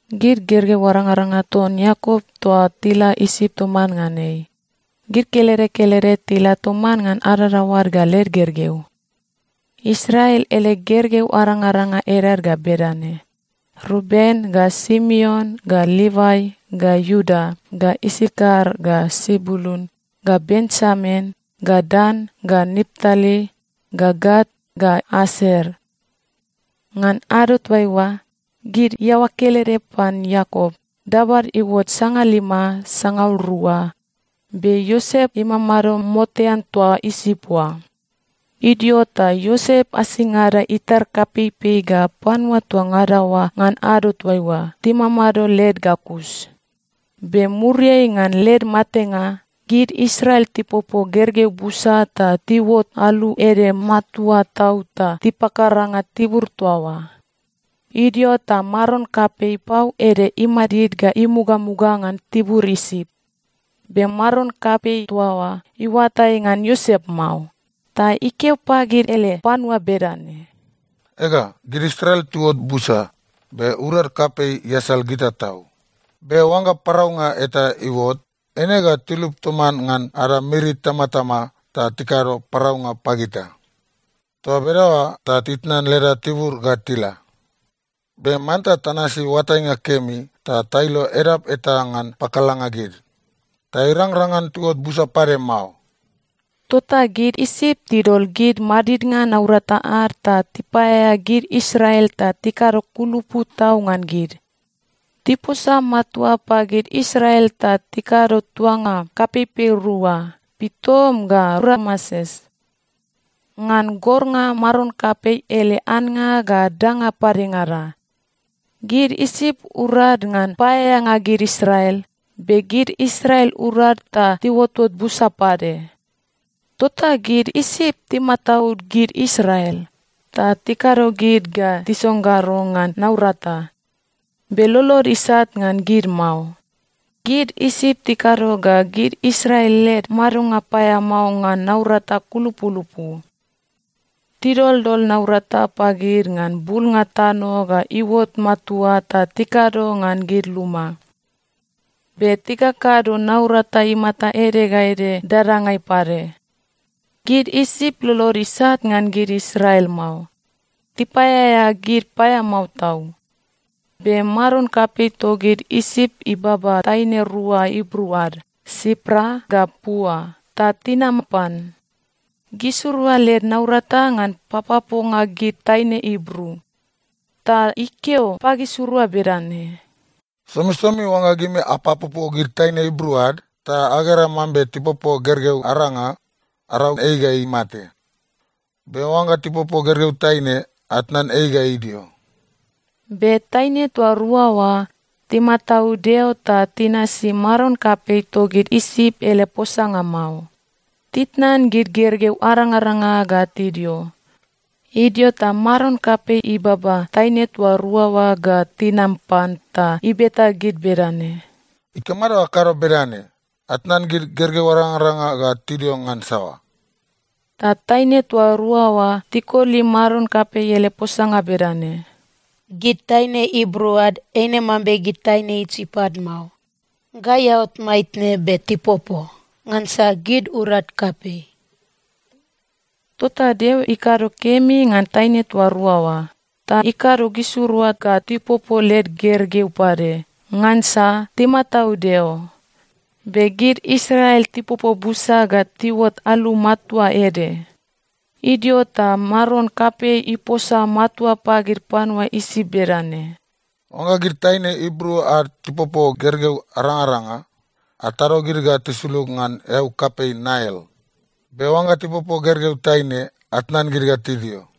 Gid gergeu arangaranga ton Iakop toa tila Isip toman ngan ei, gid kelede kelede tila toman ngan adadaoad ga led gergeu. Israel ele gergeu arangaranga edad ga bedane: Ruben ga Simeon ga Livai ga Iuda ga Isakar ga Sebulun ga Benjamin ga Dan ga Naptali ga Gat ga Aser. Ngan ado toaiua, gid iaoa kelede pan Iakop, dabad iuot sangalima sangaul rua. Be Iosep imamado motean toa Isip oa. Idio ta Iosep asingada itar kapeipei ga panua toa ngada oa ngan ado toaiua timamado led ga kus. Be muriai ngan led matenga, gid Israel tipopo gergeu busa ta tiuot alu ede matua tau ta tipakaranga tibur toa oa. Idio ta maron kapei pau ede imadid ga imugamuga ngan tibur Isip. Be maron kapei toa oa iuatai ngan Iosep mao. Ta ikeo pagid ele panua bedane, “Ega, gid Israel tiuot busa, be urad kapei iasal gita tau. Be oangga paraunga eta iuot, eine ga tilup toman ngan ada miri itamatama ta tikado paraunga pagita. Toa bedaoa ta titnan leda tibur ga tila. Be manta tanasi oatainga kemi ta tailo edap eta ngan pakalanga gid, ta irangrang ngan tiuot busa pade mao.” Tota gid Isip tidol gid madidnga naurata ad ta tipaeaea gid Israel ta tikado kulupu tau ngan gid. Tiposa matua pagid Israel ta tikado tuanga kapeipei rua, Pitom ga Rameses, ngan gornga maron kapei ele annga ga danga padengada. Gid Isip urad ngan paeaeanga gid Israel, be gid Israel urad ta tiuotot busa pade. Tota gid Isip timataud gid Israel ta tikado gid ga tisonggaro ngan naurata, be lolod isat ngan gid mao. Gid Isip tikado ga gid Israel led madonga paeamao ngan naurata kulupulupu. Tidoldol naurata pagid ngan bulnga tano ga iuot matua ta tikado ngan gid luma, be tikakado naurata imata ede ga ede dadangai pade. Gid Isip lolod isat ngan gid Israel mao. Tipaeaea gid paeamao tau. Be maron kapei togid Isip ibaba taine rua Ibru ad, Sipra ga Pua, ta tinam pan. Gisirua led naurata ngan papoponga gid taine Ibru. Ta ikeo pagisirua bedane, “Somisomi oangga gimirua apapopo gid taine Ibru ad, ta agera mambe tipopo gergeu aranga, arau ei ga imate. Be oangga tipopo gergeu taine, atnan ei ga idio.” Be taine toa rua oa timataud Deo ta tinasi maron kapei togid Isip ele posanga mao. Titnan gid gergeu arangaranga ga tidio. Idio ta maron kapei ibaba taine toa rua oa ga tinam pan ta ibeta gid bedane, “Ikamado ga akado bedane? Atnan gid gergeu arangaranga ga tidio ngan saoa?” Ta taine toa rua oa tikoli maron kapei ele posanga bedane, “Gid taine Ibru ad eine mambe gid taine Isip ad mao. Gai aot maitne, be tipopo. Ngansa gid urad kapei.” Tota Deo ikado kemi ngan taine toa rua oa, ta ikado gisirua ga tipopo led gergeu pade, ngansa timataud Deo. Be gid Israel tipopo busa ga tiuot alu matua ede. Idio ta maron kapei iposa matua pagid panua Isip bedane, “Oangga gid taine Ibru ad tipopo gergeu arangaranga, atado gid ga tisulug ngan eau kapei Nail. Be oangga tipopo gergeu taine, atnan gid ga tidio.”